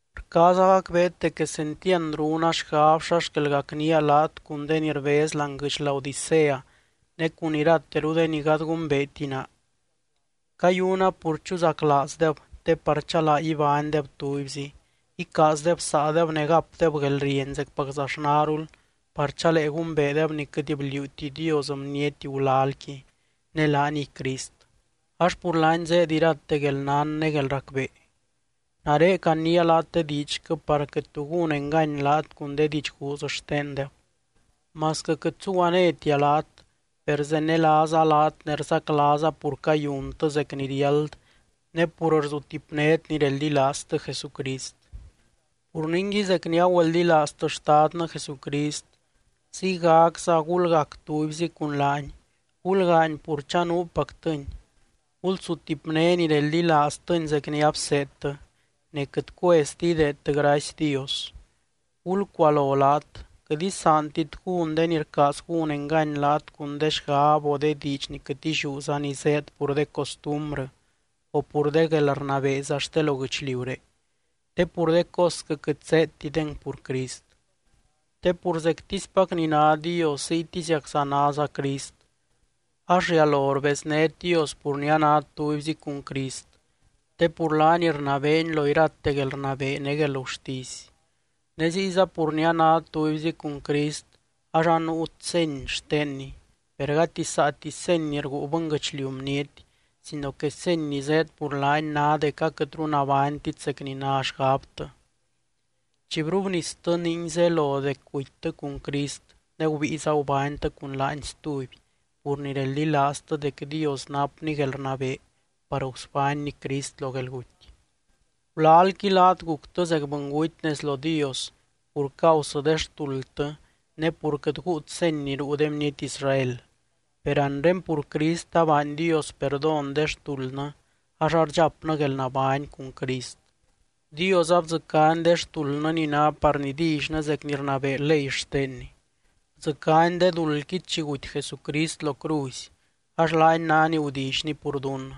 Rcaaza gacbeet dec quesentiand runa xgab xa xquel gacnía laat cun de ni rbez láani guɨdx Laodicea ne cun irateru de ni gady gumbeeti naa. Cayuna pur chuzaclaazdeb, te par chalaa ibánydeb tubyzi, icaazdeb saadeb ne gapdeb guelrieny zecpaczaxnarul par chalee gumbeedeb ni quɨt bliuuti Dios bniety gulalqui ne laaniy Crist. Ax pur laany zéed irate guelnán ne guelracbee. Nare caniia laat de diidxquɨ par quɨt tu gún engany laat cun de diidx guuz xtendeb. Masquɨ quɨt zuguanétia laat, per zenelaaza laat ne rzaclaaza pur cayuntɨ zec ni riáld ne pur rzutipnét ni reldilaaztɨ Jesucrist. Pur ningui zec ni agüeldilaaztɨ Xtadnɨ Jesucrist ziygacza gulgac tubyzi cun laany, gulgaany pur chanuupactɨny, gulsutipné ni reldilaaztɨny zec ni abseedtɨ ne quɨt cuezti ideedtɨ gracy Dios. Gulcualo laat. Quɨt isaantit gún de ni rcaaz gún engany laat cun de xgab o de diidx ni quɨt illiúza ni zéed pur de costumbrɨ o pur de guelrnabeeza xte lo guɨchliuré, te pur de cosquɨ quɨt zéedtideng pur Crist. Te pur zectispac ni ná Dios ziytiziacza náza Crist. Ax rialo rbeznét Dios pur ni anát tubyzi cun Crist, te pur laany rnabeeny lo irate guelrnabee ne guelgurtisy. Ne ziyza pur ni anát tubyzi cun Crist ax anuut seny xtenny, per gati saati seny ni rguu bɨnguɨchliu bniety, sino que seny ni zéed pur laany ná dec aquɨtru nabánytit zec ni ná xgabtɨ. Chi brubnistɨ ningui zelo dec gutytɨ cun Crist ne gubíiza gubánytɨ cun laany stuby pur ni reldilaaztɨ dec Dios napny guelrnabee par gusbánny Crist lo guelguty. Gulalqui laat guctɨ zec bɨnguty nez lo Dios pur causɨ de xtuldtɨ ne pur quɨt guut seny ni ruu de bniety Israel. Per anre pur Crist abaany Dios perdón de xtuldnɨ ax ardxapnɨ guelnabány cun Crist. Dios abdzɨcány de xtuldnɨ ni ná par nidillynɨ zec ni rnabee ley xtenny, bdzɨcány de duldqui chi guty Jesucrist lo cruzy ax laany ná ni gudillyny pur dunnɨ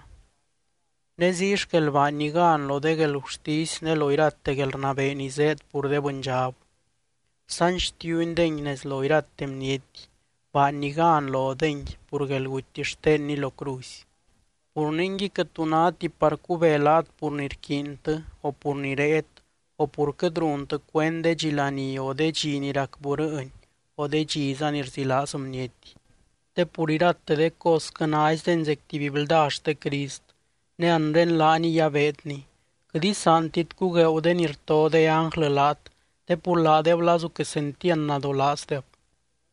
Ne ziy xquel baanny gan lo de guelgurtisy ne lo irate guelrnabee ni zéed pur de bɨndxab. Bsanxtiuny dengui nez lo irate bniety, baanny gan lo dengui pur guelguty xtenny lo cruzy. Pur ningui, quɨt tu náti par cubee laat pur ni rquiintɨ o pur ni réet o pur quɨt runtɨ cuend de dxi laní o de dxi ni rac búiurɨɨny o de dxiza ni rzilaaz bniety. Te pur irate de cosquɨ naizdeni zec tuby blda xte Crist, ne anre laaniy abeedny. Quɨt isaantit cugueeu de ni rto de ánglɨ laat te pur laadeb lazu quesentiand nadolaazdeb.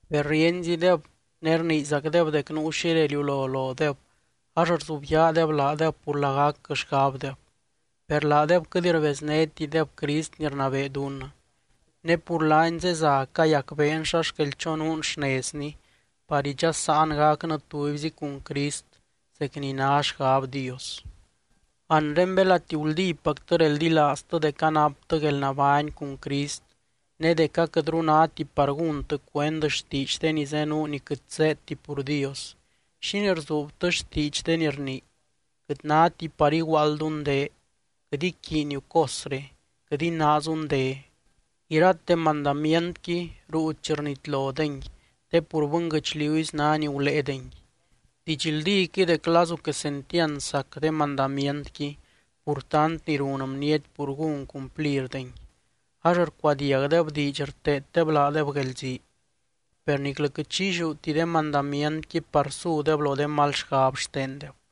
Per ríenzideb ne rniizacdeb dec nuu xi reliulo lodeb ax rzubyaadeb laadeb pur lagacquɨ xgabdeb. Per laadeb quɨt rbeznétideb Crist ni rnabee dunnɨ. Ne pur laany zeza cayacbeen xa xquel chonuun xnezny par idxasaan gacnɨ tubyzi cun Crist zec ni ná xgab Dios. Anre belati guldípactɨ reldilaaztɨ dec anaptɨ guelnabány cun Crist ne dec aquɨtru náti par gúntɨ cuend xtiidx de ni zenuu ni quɨt zéedti pur Dios, ¿xínii rzuubtɨ xtiidx de ni rnii: “Quɨt náti par iguaaldu nde. Quɨt iquiiniu cosre. Quɨt inaazu nde?” Irate mandamientqui ruu chi rnitlodengui te pur bɨnguɨchliuzi ná ni gulée dengui. Didxldíquɨy dec lazu quesentiand sac de mandamientqui pur tant ni run bniety pur gún cumplirdengui ax rcuadiagdeb diidx rteeddeb laadeb guelzii, per niclɨ quɨt xi illiúti de mandamientqui par sudeb lo de mal xgab xtendeb.